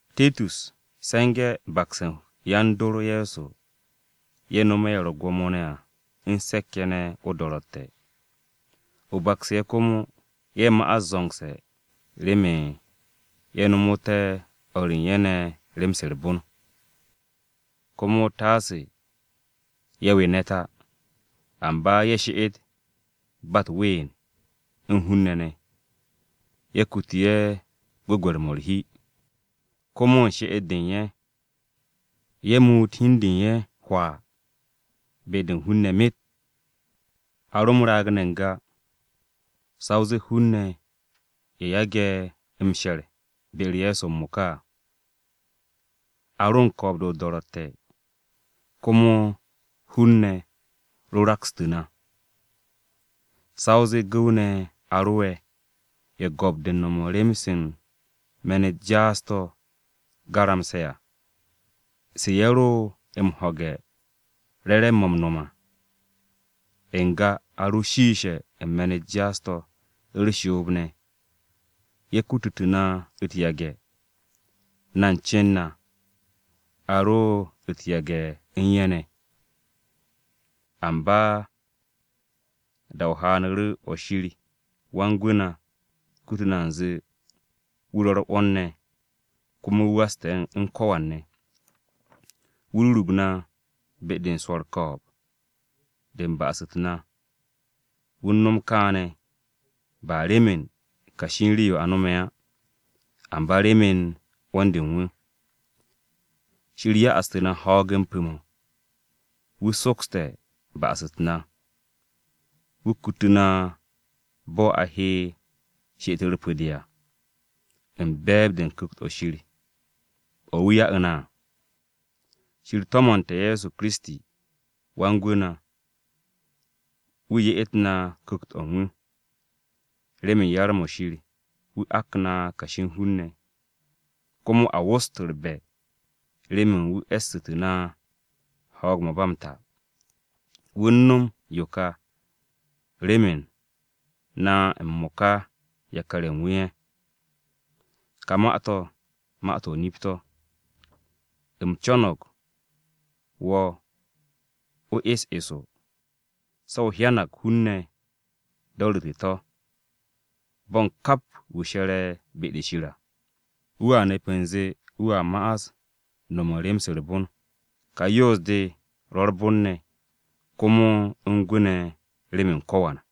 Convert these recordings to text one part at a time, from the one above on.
Titus, se̱nge̱ bakse̱ u̱n yan-dor Ye̱so ye̱ nome̱ ye̱ ro̱ u̱t-gwo̱mo à u̱n se̱k-ye̱ ne̱ o-do̱ro̱tte̱. O baksu̱ ye̱ komo, ye̱ ma'as zo̱ngse̱ remen ye̱ nomote̱ o̱r u̱n ye̱ ne̱ rem-se u̱r-bon. Komo taase ye̱ we ne̱t á, amba ye̱ she'et ba u̱t-ween u̱n hun-ne̱ ne̱, ye̱ kutu ye̱ gwu̱gwe̱r-mo̱ u̱r-hi. Komo u̱n she'et-de u̱n ye̱, ye̱ muut hi u̱n de u̱n ye̱ hwaa be-de u̱n hun-ne̱ myet. A ro m-raag ne̱ n-ga, sa o zee hun-ne̱ ye̱ yage̱ m-she̱r be-u̱r Ye̱so m-mo̱ka à. A ro u̱n ko̱o̱b-de o-do̱ro̱tte̱, komo hun-ne̱ ro rakstu̱ na. Sa o zee gu̱w-ne̱ a ro'e̱, ye̱ go̱p-de u̱n no̱m u̱n rem-se u̱n me̱n-u̱t jaas-to̱ garamse̱ à, se ye̱ ro̱ m-ho̱ge̱ re̱re̱m-mo̱ m-no̱m à. N-ga a ro shiishe̱ u̱n me̱n-u̱t jaas-to̱, u̱r-shoob ne̱, ye̱ kututu̱ na u̱t-yage̱, na u̱n cen na, a ro̱ u̱t-yage̱ u̱n ye̱ ne̱. Amba da-o haanu̱ru̱ o̱ Shir Wan-Gwu̱ na kutu̱ na u̱nze wu̱ ro̱ u̱r-'wo̱n ne̱, komo wu̱ waste̱ u̱n ko̱wan ne̱. Wu̱ rurug na be-de u̱n swo̱ u̱r-ko̱o̱b de u̱n ba'as-u̱t na, wu̱ u̱n no̱m kaane̱ ba remen kashi u̱n rii-yo a no̱me̱ á. Amba remen 'wo̱n-de u̱n wu̱. Shir ya'astu̱ na ho̱o̱g-m pu̱-mo̱. Wu̱ sokste̱ ba'as-u̱t na, Wu̱ kutu na bo̱ a he she'et-u̱r pu̱-de à, u̱n be̱e̱b-de u̱n Ku̱kt-o̱ Shir, o̱ wu̱ ya'u̱ na à. Shir to̱mo̱nte̱ Ye̱so Kiristi, Wan-Gwu̱ na, wu̱ ye'et na Ku̱kt-o̱ u̱n wu̱. Remen yar-mo̱ Shir wu̱ ak na kashi u̱n hun-ne̱, komo a wost u̱r-be̱ remen wu̱ e̱ssu̱tu̱ na ho̱o̱g-m ba m-ta. Wu̱ u̱n no̱m yo ka remen na m-mo̱ka yakar-ye̱ u̱n wu̱ ye̱. Ka ma-to̱, ma-to̱ o-nip to̱. U̱m co̱no̱g wo̱ o es eso, se̱ o hyanag hun-ne̱ do̱ru̱te̱ to̱, bo̱n kap wu̱ she̱re̱ be-de Shir à, wu̱a nep u̱nze wu̱a ma'as u̱n no̱m rem-se u̱r-bon. Ka yoos-de ro̱ u̱r-bon ne̱ komo u̱n gwu̱ ne̱ remen ko̱wan.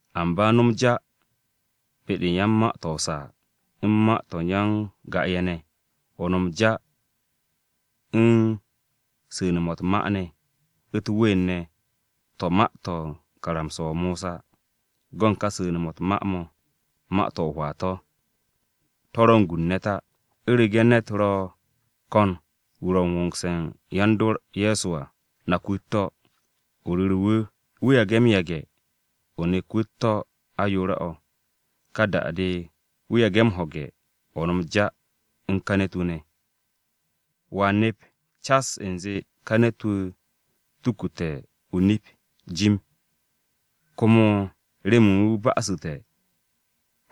Amba no̱m ja be-de u̱n yan-ma-to̱ o-saa u̱n ma-to̱ u̱n ya-n-ga-ye̱ ne̱, o no̱m ja u̱n su̱ne̱-mo̱ u̱t-ma ne̱, u̱t-ween ne̱ to̱ ma-to̱ u̱n karamsa-o Mosa. Go̱n ka su̱nu̱-mo̱ u̱t-ma mo̱, ma-to̱ o-hwaa to̱, to̱ ro̱ u̱n gu u̱n ne̱t á. U̱rege̱ ne̱t ro̱ ko̱n wu̱ ro̱ u̱n wo̱ngse̱ u̱n yan-dor Ye̱so à, nak wu̱ u̱t-to̱, o ru̱ru̱ wu̱, wu̱ yage̱ m-no̱m kaane̱. Wu̱ yage̱ m-yage̱, o nek wu̱ u̱t-to̱ ayoore̱-o̱. Ka da-de wu̱ yage̱ m-ho̱ge̱, o no̱m ja u̱n ka ne̱t-wu̱ ne̱. Wo̱a nep cas u̱nze ka ne̱t-wu̱ tukute̱ o-nip jim, komo remen wu̱ ba'asu̱te̱,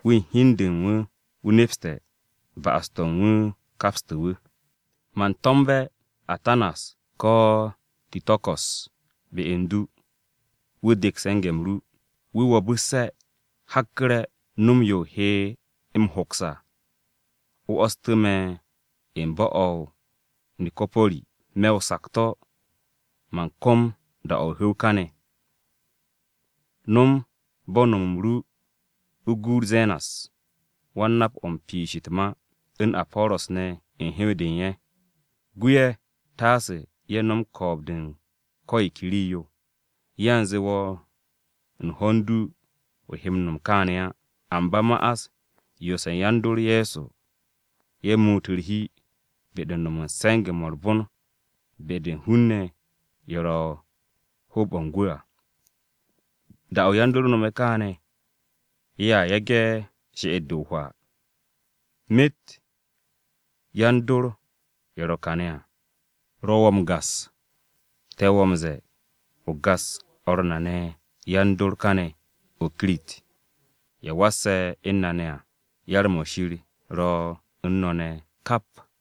wu̱ u̱n hi u̱n de u̱n wu̱ nepste̱ ba'as-to̱ u̱n wu̱ kapste̱ wu̱. Man to̱mbe̱ Atanas ko̱ Tiko̱ko̱s be u̱n du, wu̱ dek se̱nge̱-m ru. Wu̱ wo̱bu̱sse̱, hakku̱re̱ nom yo o he m-hoks à, o 'wo̱stu̱ me̱ u̱n bo̱-o̱ o-Nikopori. Me̱ o-sakto̱ man kom da-o̱ o-hu̱w káne̱. No̱m bo̱ u̱n no̱m-m ru o guut Zenas (Wan-nap-o̱ u̱n piish u̱t-ma) u̱n Apo̱ro̱s ne̱ u̱n hew-de u̱n ye̱. Gu ye̱, taase ye̱ nom ko̱o̱b-de u̱n ko̱ yo ke rii-yo. Yanze wo̱ u̱n ho̱n du o he m-no̱m kaane̱ á, amba ma'as yoose̱ yan-dor Ye̱so ye̱ muut u̱r-hi be-de u̱n no̱m u̱n se̱nge̱-mo̱ u̱r-bon be-de u̱n hun-ne̱ ye̱ ro̱ u̱n hoob-o̱ u̱n gwu̱ à. Da-o̱ yan-dor nome̱ kaane̱ ye̱a yage̱ she'et-de o-hwaa. Myet yan-dor ye̱ ro̱ kàne̱ à, ro̱ wo̱ m-gas. Te̱ wo̱ m-ze̱e̱ o gas o̱r na ne̱ yan-dor káne̱ u̱n o-Kirit, ye̱ wasse̱ u̱n na ne̱ à. Yar-mo̱ Shir ro̱ u̱n no̱ ne̱ kap!